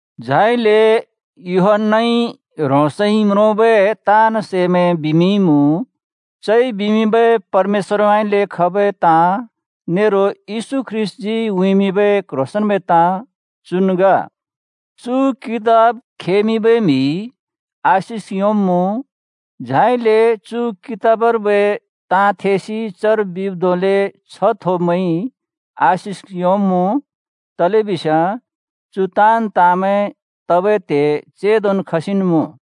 झाइले यूहन्‍नाइ ह्रोंसइ म्रोंबै ताँन् सैमैं बिमिंइमुँ, चइ बिमिंबै परमेश्‍वरउँइँले खबै ताँ नेरो येशू ख्रीष्‍टजी उँइँमिंबै क्ह्रोंसेंन्बै ताँ चुन् ग। चु कितब खेमिंबै म्‍हिइ आशिक योंब्मुँ, झाइले चु कितबर्बै ताँ थेसि चर बिब् धोंले छ्ह थोब्मैंइ आशिक योंब्मुँ, तलेबिस्याँ चु ताँन् ताँमैं तबै त्हे चेंदोन् खसिन् मुँ।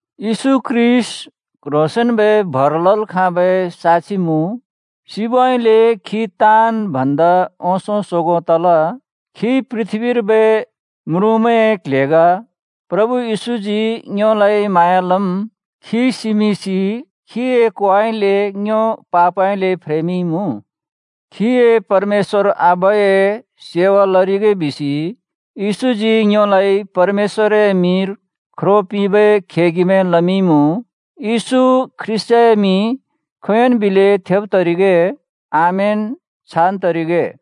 येशू ख्रीष्‍ट क्ह्रोंसेंन्‍बै भर लल् खाबै साक्षि मुँ, सिबउँइँले खी ताँन् भन्दा ओंसों सोगों तल, खी पृथ्‍बीर्बै म्रुँमैंए क्ल्हे ग। प्रभु येशूजी ङ्योलाइ म्हाँया लम्। खी सिमिंसि खीए कोउँइँले ङ्यो पापउँइँले फ्रेमिंइमुँ। खीए परमेश्‍वर आबाए सेवा लरिगे बिसि येशूजी ङ्योलाइ परमेश्‍वरए मिंर ख्रो पिंबै खेगिमैं लमिंइमुँ। येशू ख्रीष्‍टए मिं खोंयोंन् बिलै थेब् तरिगे। आमेन, छान् तरिगे।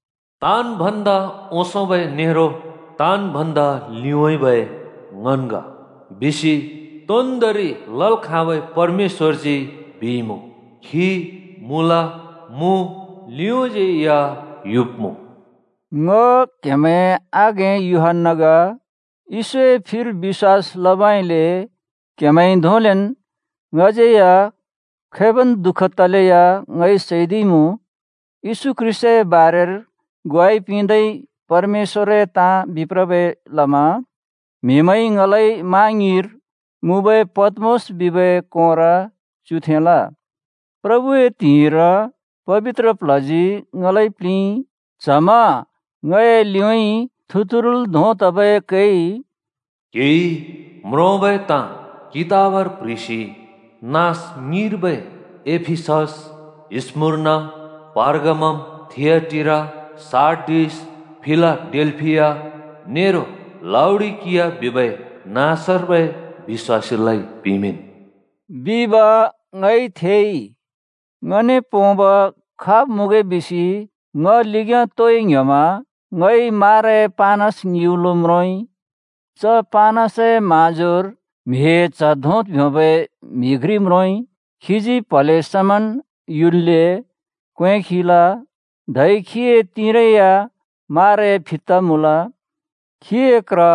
“ताँन् भन्दा ओंसोंबै नेरो ताँन् भन्दा लिउँइँबै ङन् ग। बिसि तोन्दोंरि लल् खाँबै परमेश्‍वरजी बिइमुँ, खी मुँल, मुँ, लिउँज्यै या युब्‍मुँ। ग!” ङ क्‍हेमैंए आघें यूहन्‍ना ग। येशूए फिर बिश्‍वास लबइले क्‍हेमैंइ धोंलेन् ङज्यैया खैबन् दु:ख तलैया ङइ सैदिइमुँ। येशू ख्रीष्‍टए बारेर ग्वाइ पिंदै परमेश्‍वरए ताँ बिप्रबै लमा म्‍हिमैंइ ङलाइ मा ङ्युँइर मुँबै पत्‍मोस बिबै कोंर च्युथेंल। प्रभुए त्हिंइर पबित्र प्ल्हजी ङलाइ प्लिंइ। च्हमा ङए लिउँइँ थुतुरुल् धों तबै कैइ, “क्‍हिइ म्रोंबै ताँ कितबर प्‍ह्रिसि नाँस ङिर्बै एफिसस, स्‍मुर्ना, पर्गामम, थिआटीरा, सार्डिस, फिलाडेल्‍फिया नेरो लाउडिकिया बिबै नाँसर्बै बिश्‍वासीलाइ पिमिंन् बिब ङइ थेइ।” ङने पोंब खाब् मुँगे बिसि ङ लिग्‍याँ तोइ ङ्‍ह्‍योमा ङइ माराए पानस ङिउलो म्रोंइ। च पानसए म्हाँजोर म्‍हिए च्ह धों ब्योंबै म्हि घ्रि म्रोंइ। खीजी प्‍हले समान् युल्‍ले क्‍वें खिल, धै खीए तिंरै या माराए फित्ता मुँल। खीए क्र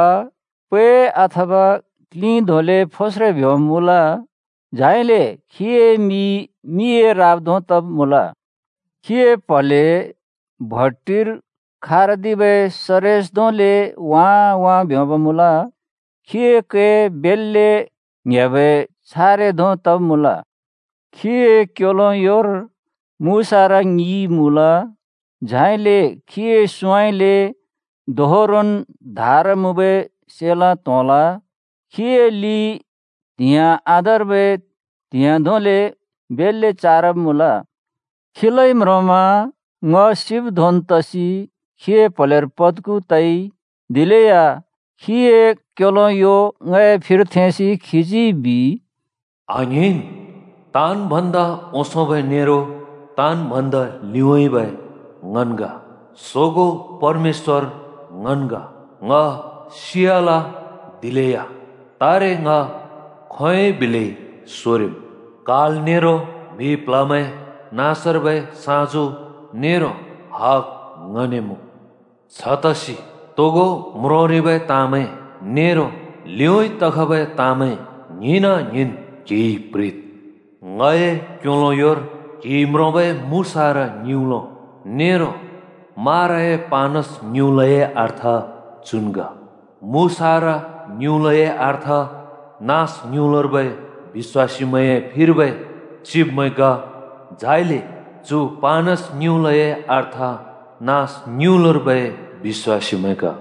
पै, अथवा क्‍लिं धोंले फोस्रे ब्‍योंब मुँल। झाइले खीए मि मिए राब धों तब् मुँल। खीए प्‍हले भट्टिर खारदिबै सरेस धोंले वाँ वाँ ब्योंब् मुँल। खीए कै बेल्‍ले ङ्‍हेबै छारे धों तब् मुँल। खीए क्‍योलो योर मुसारा ङि मुँल। झाइले खीए सुँउँइँले दोहोरोन् धार मुँबै सेलाँ त्‍होंल। खीए लि त्‍हिंयाँ आधार्बै त्‍हिंयाँ धोंले बेल्‍ले चारब मुँल। खीलाइ म्रोंमा ङ सिब् धोंन् तसि खीए प्‍हलेर पत्गु तइ। दिलेया खीए क्‍योलो यो ङए फिर थेंसि खीजी बिइ, “आङ्हिंन्, ताँन् भन्दा ओंसोंबै नेरो ताँन् भन्दा लिउँइँबै ङन् ग। सोगों परमेश्‍वर ङन् ग। ङ सियाल, दिलेया तारे ङ खोंयोंइ बिलै सोरिम्। काल नेरो म्‍हि प्‍ल्‍हमैं नाँसर्बै साँजु नेरो हग ङने मुँ। छतसि तोगो म्रोंरिबै ताँमैं नेरो लिउँइँ तखबै ताँमैं ङ्हिंन-ङ्हिंन् क्‍हिइ प्‍ह्रिद्। ङए क्‍योलो योर क्‍हिइ म्रोंबै मुसारा ङिउलो नेरो माराए पानस ङिउलोए अर्थ चु ग: मुसारा ङिउलोए अर्थ नाँस ङिउलोर्बै बिश्‍वासीमैंए फिर्बै चिब्मैं ग, झाइले चु पानस ङिउलोए अर्थ नाँस ङिउलोर्बै बिश्‍वासीमैं ग।